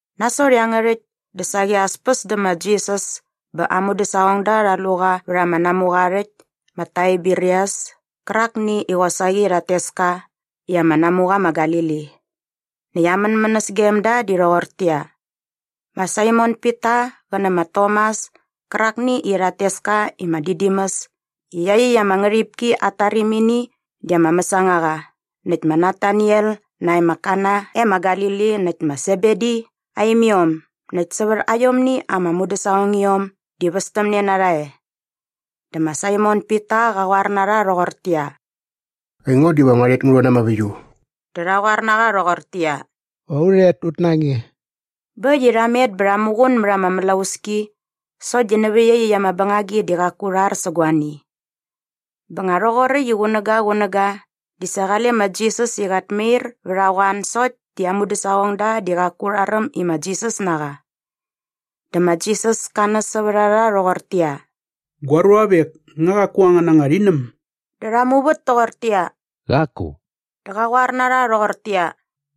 Nasot iangärhäkt dä saqi as päs dä ma Jisas bä aa mudäsaqongda rha lu qa vät ama namuqa aa rhäkt ma Taiberias kärakni i qosaqi i rhat tes ka i ama namuqa ma Galili. Näkt aa mänmänäs gem da di rhoqortäqyia. Ma Saimon Pita qä nä ma Tomas kärakni i rhat tes ka i ma Didimus i iaqyäkt ama ngärhipki at tarimini di ama mäsangaqa näkt ma Nataniel nae ma Kana e ma Galili näkt ma Sebedi aa imiom näkt sävät aiomni ama mudäsaqongiom di västämne na rha e. Dä ma Saimon Pita qa qoar na rha rhoqortäqyia, “Aingo diva ngua rhet ngu rhon na ama väiu.” Dä rha qoar na qa rhoqortäqyia, “Va u rhet ut na nge.” Bä äkt i rha met bä rha muqun mät ama mlauski sokt di nävä iaqyäkt ama bängagi di qaku rha ar sä guani. Bä nga rhoqoräkt i qunäga qunäga di sa qale ma Jisas i qat mair vät a qoan sokt di aa mudäsaqongda di qaku rha räm i ma Jisas na qa. Dä ma Jisas ka näs sävät a rha rhoqortäqyia, “Gua ruavek, nga qaku angän anga rhinäm?” Dä rha muvät toqortäqyia, “Qaku.” Dä qa qoar na rha rhoqortäqyia,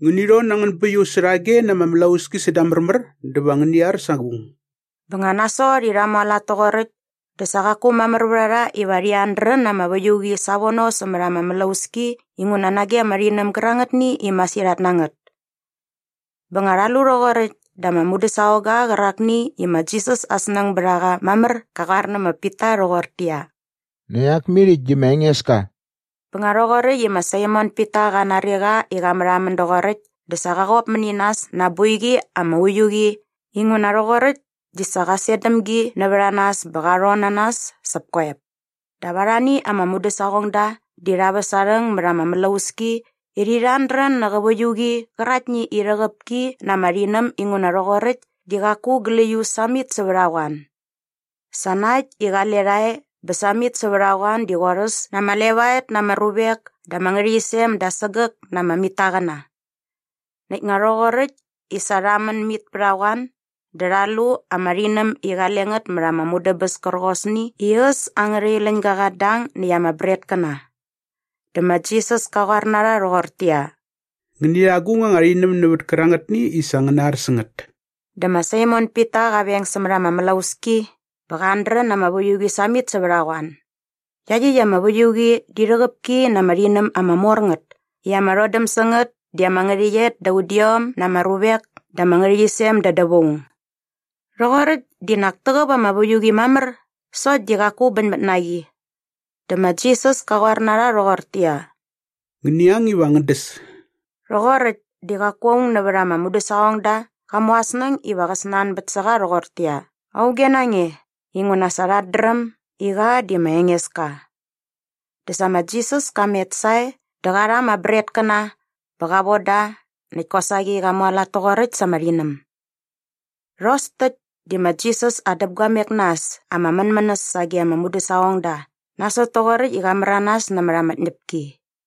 “Ngäni rhon na angän bäiuqi särhage na ama mlauski säda märmär dä va ngäni ar sa agung.” Bä nga nasot i rha mualat toqoräkt dä sa qaku mamär vät a rha iva rhi ardrän na ama väiuqi savono sämät ama mlauski inguna nage ama rhinäm gärangätni i masirhat na ngät. Bä nga rha lu rhoqoräkt dä ama mudäsaqongga qärakni i ma Jisas aa snäng bät a qa mamär qa qoar nä ma Pita rhoqortäqyia, “Nak iak mit äkt di ma Engeska.” Bä nga rhoqoräkt i ma Saimon Pita qa nari qa i qä märhamän doqoräkt dä sa qa qop mäni nas na aa boiqi ama uiu qi inguna rhoqoräkt di sa qa set däm gi nävät aa nas bä qa rhon na nas säp koep. Dap arhani ama mudäsaqongda di rha väs aa rhäng mät ama mlauski i rhi rhardrän nä qä väiuqi qäraktni i rhäqäp ki na ama rhinäm inguna rhoqoräkt di qaku gläius samit sävät a qoan. Sa na äkt i qale rha e bä samit sävät a qoan di qorhäs na ama levaet na ama ruvek da ama ngärhäqyisem da sägäk na ama mitaqäna. Näkt nga rhoqoräkt i sa rha män mit pät a qoan dä rha lu ama rhinäm i qale ngät mät ama mudäbäs kärqosni i äs angärha iläñga qat dang näkt ama bretkäna. Dä ma Jisas ka qoar na rha rhoqortäqyia, “Ngäni rha agung anga rhinäm nävät kärangätni i sa ngäna ar sä ngät.” Dä ma Saimon Pita qa veng sämät ama mlauski bä qa ardrän na ama väiuqi samit sävät a qoan. Iaqyäkt ama väiuqi di rhäqäp ki na ama rhinäm ama mor ngät i ama rhodäm sä ngät di ama ngärhäqyet da udiom na ama ruvek da ama ngärhäqyisem da dävaung. Rhoqoräkt di nak täqäp ama väiuqi mamär sokt di qaku bäñmät na qi. Dä ma Jisas ka qoar na rha rhoqortäqyia, “Ngäni ang iva ngän däs.” Rhoqoräkt di qaku aung nävät ama mudäsaqongda qa mu aa snäng iva qä snanbät sä qa rhoqortäqyia, “Auge na nge?” inguna sa rhat dräm i qa di ma Engeska. Dä sa ma Jisas ka met sae dä qa rha ama bretkäna bä qa von da näkt kosaqi qa mualat toqoräkt sa ama rhinäm. Rhos täkt di ma Jisas aa däpguamek na äs ama mänmänäs sage aa mudäsaqongda nasot toqoräkt i qa märanas nämät ama tñäpki.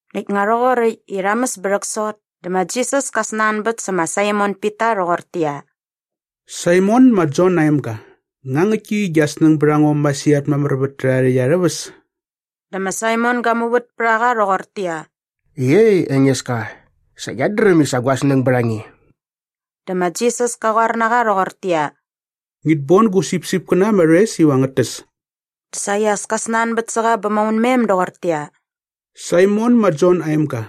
Näkt nga rhoqoräkt i rha mäs bä rhäksot dä ma Jisas ka snanbät sä ma Saimon Pita rhoqortäqyia, “Saimon ma Jon aa emga, nga ngäktki i gia snäng bät a ngo masirhat mamär vät tärhärha rhäkt arhä väs?” Dä ma Saimon ga muvät pät a qa rhoqortäqyia, “Iei Engeska, sa ngiat dräm i sa gua snäng bät a nge.” Dä ma Jisas ka qoar na qa rhoqortäqyia, “Ngit bon gu sipsipkäna ama rhoes iva ngät täs.” Dä saqi as ka snanbät sä qa bä maunmem doqortäqyia, “Saimon ma Jon aa emga,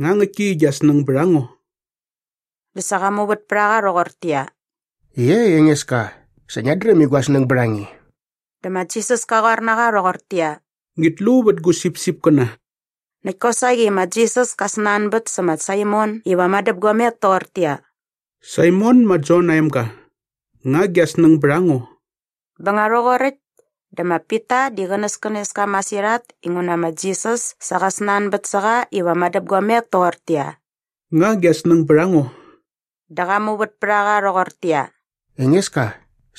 nga ngäktki i gia snäng bät a ngo?” Dä sa qa muvät pät a qa rhoqortäqyia, “Iei Engeska, sa ngiat dräm i gua snäng bät a nge.” Dä ma Jisas ka qoar na qa rhoqortäqyia, “Ngit lu vät gu sipsipkäna.” Näkt kosaqi ma Jisas ka snanbät sä ma Saimon iva madäpguamek toqortäqyia, “Saimon ma Jon aa emga, nga gia snäng bät a ngo?” Bä nga rhoqoräkt dä ma Pita di qänäskänes ka masirhat inguna ma Jisas sa qa snanbät sä qa iva madäpguamek toqortäqyia, “Nga gia snäng bät a ngo?” Dä qa muvät pät a qa rhoqortäqyia, “Engeska,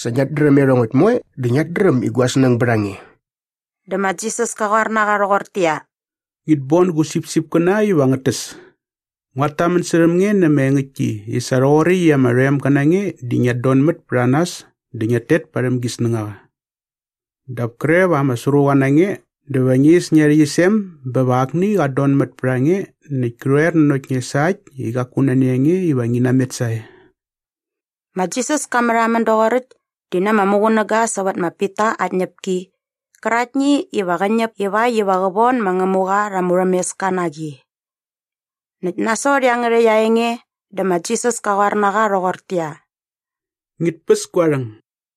sa ngiat dräm iarhongäkt moe dä ngiat dräm i gua snäng bät a nge.” Dä ma Jisas ka qoar na qa rhoqortäqyia, “Ngit bon gu sipsipkäna iva ngät täs. Nguat tamän särhäm nge na ama engäktki i sa rhoqoräkt i ama rhoemga na nge di ngiat donmät pät a nas dä ngiat tet parhäm gi snängaqa. Dap kre va ama sruqa na nge dä va ngi is ngia rhäqyisem bä va akni qat donmät pät a nge nakt kä rhoer nanokt nge sa äkt i qaku nani a nge iva ngi namet sae.” Ma Jisas ka märhamän doqoräkt di na ama muqunäga sävät ma Pita aa tñäpki qäraktni iva qä ñäp ivakt iva qä von ma Ngämuqa rha ama murhämeska na qi. Näkt nasot iangärhäkt aa enge dä ma Jisas ka qoar na qa rhoqortäqyia, “Ngit päs gua rhäng!”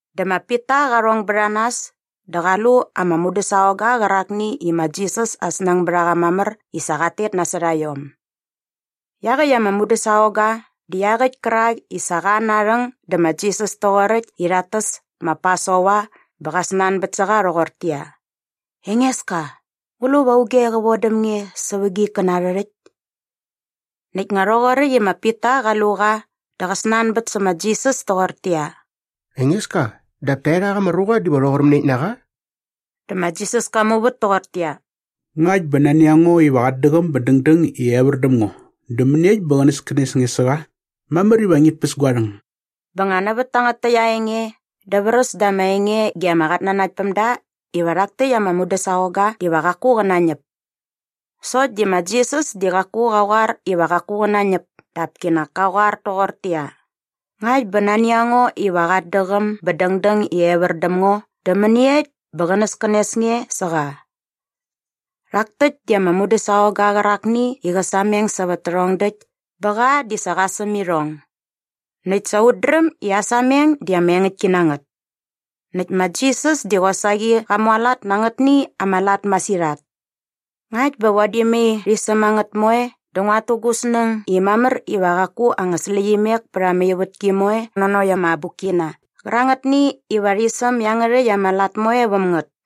Dä ma Pita qa rhong bät a nas dä qa lu ama mudäsaqongga qärakni i ma Jisas aa snäng bät a qa mamär i sa qat tet nasot a iom. Iaqäkt ama mudäsaqongga di iaqäkt kärak i sa qa an aa rhäng dä ma Jisas toqoräkt i rhat täs ma Pasova bä qa snanbät sä qa rhoqortäqyia, “Engeska, ngu lu va auge qä vodäm nge sävä gia ikkäna arhä rhäkt?” Näkt nga rhoqoräkt i ma Pita qa lu qa dä qa snanbät sä ma Jisas toqortäqyia, “Engeska, dap taerhak ama ruqa diva rhoqor mäniekt na qa?” Dä ma Jisas ka muvät toqortäqyia, “Ngakt bä nani a ngo iva qat däqäm bä dängdäng i evär däm ngo dä mäniekt bä qänäskänes nge sä qa? Mamär iva ngit päs gua rhäng.” Bä nga nävät tangät täkt aa enge dä vräs da ama enge ge ama qatnanaktpämda iva rhak täkt ama mudäsaqongga diva qaku qä nañäp. Sokt di ma Jisas di qaku qa qoar iva qaku qä nañäp dap kinak ka qoar toqortäqyia, “Ngakt bä nani a ngo iva qat däqäm bä dängdäng i evär däm ngo dä mäniekt bä qänäskänes nge sä qa?” Rhak täkt di ama mudäsaqongga qärakni i qä sameng sävät tärhong däkt bä qa di sa qa säm irhong. Näkt sa ut dräm i aa sameng di ama engäktki na ngät. Näkt ma Jisas di qosaqi qa mualat na angätni ama lat masirhat. Ngakt bä vadi mai rhi säm a ngät moe dä nguat tu gu snäng i mamär iva qaku anga släqyimek pät ama ivätki moe nanokt ama abukkina qärangätni iva rhi säm iangärhäkt ama lat moe väm ngät.